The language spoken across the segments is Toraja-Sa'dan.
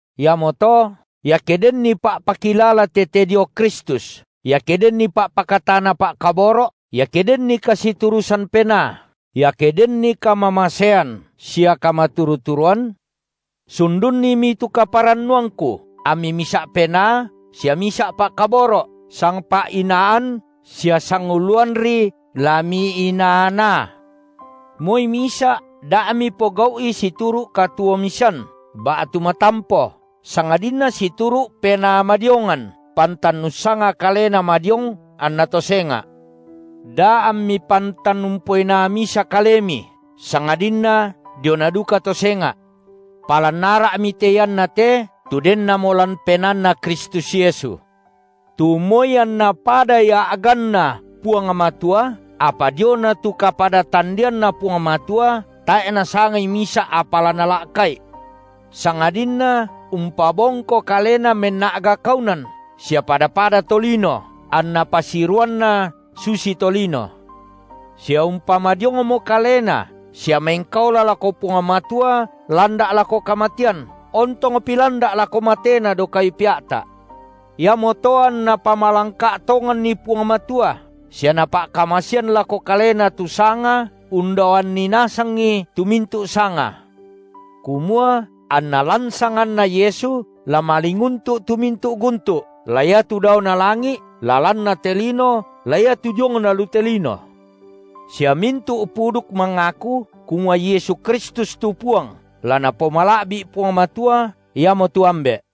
Iamoto, iake denni pa’pakilala tete dio Kristus, iake denni pa’pakatana pa’kaboro’, iake denni kasiturusan Penaa, iake denni kamamasean sia kamaturu-turuan, sundunnimi tu kaparannuangku, ammi misa’ penaa, sia misa’ pa’kaboro’, sangpa’inaan sia sanguluanri la miinaa-naa. Moi misa’ da mipogau’i situru’ katuo-misan ba’tu matampo, sangadinna situru’ penaa madiongan, pantan ussanga kalena madiong anna to senga’, Da ammi pantan umpoinaa misa kalemi, sangadinna diona duka to senga’. Palan ara’mi te inaa iate, tu dennamo lan penaanNa Kristus Yesu, tu moi anNa pada Ia a’ganNa Puang Matua, apa diona tu kapada-tandeanNa Puang Matua tae’ nasangai misa’ apa la nala’ka’I, sangadinna umpabongko Kalena menna’ga kaunan sia pada-pada tolino, anna pasiruanNa susi tolino; sia umpamadiongmo Kalena sia mengkaola lako Puang Matua landa’ lako kamatean, ontongpi landa’ lako matena dao kayu pea’ta’. Iamoto anNa pamalangka’ tonganNi Puang Matua sia Napa’kamasean lako Kalena tu Sanga, undaoan nasangi tu mintu’ sanga, kumua anna lan sanganNa Yesu la malinguntu’ tu mintu’ guntu’, la iatu daona langi’, la lanna te lino, la iatu diongna lu te lino, sia mintu’ puduk mangaku, kumua Yesu Kristus tu Puang, la napomala’bi’ Puang Matua, Iamotu Ambe’.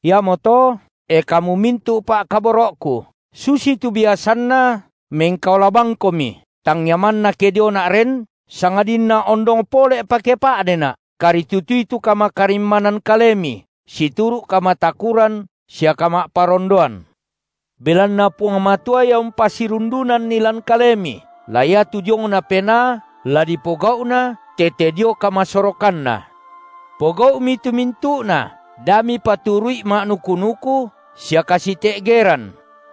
Iamoto, e kamu mintu’ pa’kaboro’ku, susitu biasanna mengkaola bangkomi, tangia manna ke diona’ ren, sangadinna ondong pole’pa ke pa’dena’, karitutui tu kamakarimmanan kalemi situru’ kamatakuran sia kama’parondoan, belanna Puang Matua Ia umpasirundunanni lan kalemi, la iatu diongna penaa, la dipogau’na tete dio kamasorokanNa. Pogau’mi tu mintu’na, da mipaturu’i ma’nuku-nuku, sia kasite’geran,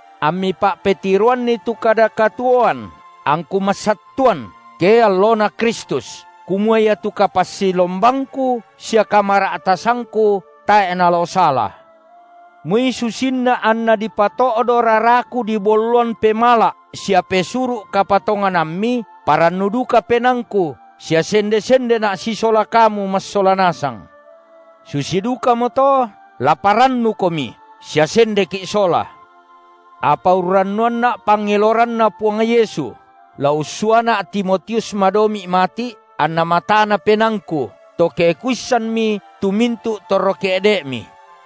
ammi pa’petiroanni tu kada katuoan, angku massattuan, ke alloNa Kristus, kumua iatu kapassilombangku sia kamara’tasangku tae’ nalao sala. Moi susinna anna dipato’do raraku dibolloan pemala’ sia pesuru’ kapatonganammi, parannu duka penaangku sia sende-sendena’ sisola kamu massola nasang, susi dukamoto la parrannukomi sia sendeki’ sola. Apa urrannuanna’ pangeloranNa Puang Yesu, la ussuana’ Timotius madomi’ mati’, anna matana penaangku, to ke kuissanmi tu mintu’ torro ke’de’mi.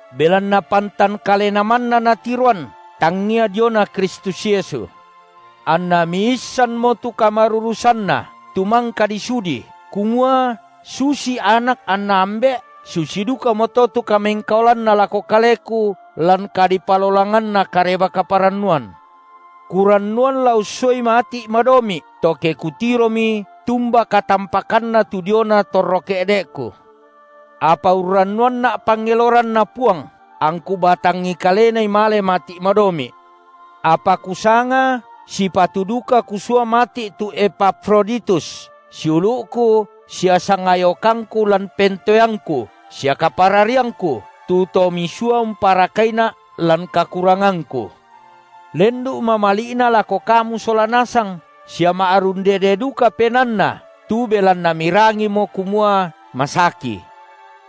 Belanna pantan kalena manna natiroan, tangia diona Kristus Yesu. Anna miissanmo tu kamarurusanna tu mangka disudi, kumua susi anak anna ambe’, susi dukamoto tu kamengkaolanna lako kaleku lan kadipalolanganna Kareba-kaparannuan. Kurannuan la ussuai mati’ madomi’, to ke kutiromi tumba katampakanna tu diona torro ke’de’ku. Apa urrannuanna’ pangeloranNa Puang, angku batangi kalenai male mati’ madomi’. Apa kusanga sipatu duka kusua mati’ tu Epafroditus, siulu’ku sia sangayokangku lan pentoeangku sia kaparariangku, tu to misua umparakaina’ lan kakurangangku, lendu’ mamali’na lako kamu sola nasang, sia ma’rundede duka penaanna tu belanna mirangimo kumua masaki.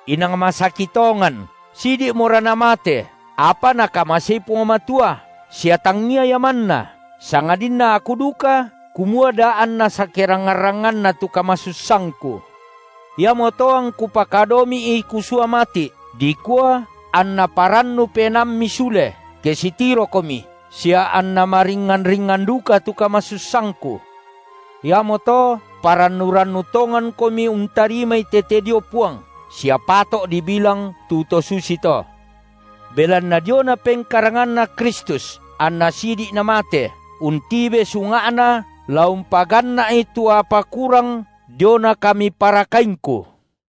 Inang masaki tongan, sidi’mora namate, apa Nakamasei Puang Matua, sia tangia ia manna, sangadinna aku duka kumua da anna sakerangngan-rangnganna tu kamasussangku. Iamoto angku pakadomi’i kusua mati’, dikua anna parannu penaammi sule ke sitirokomi sia anna maringngan-ringngan duka tu kamasussangku. Iamoto parannu-rannu tongankomi untarimai tete dio Puang, sia pato’ dibilang tu to susito. Belanna diona pengkaranganNa Kristus anna sidi’ namate, untibe sunga’na la umpaganna’i tu apa kurang diona kamiparakaingku.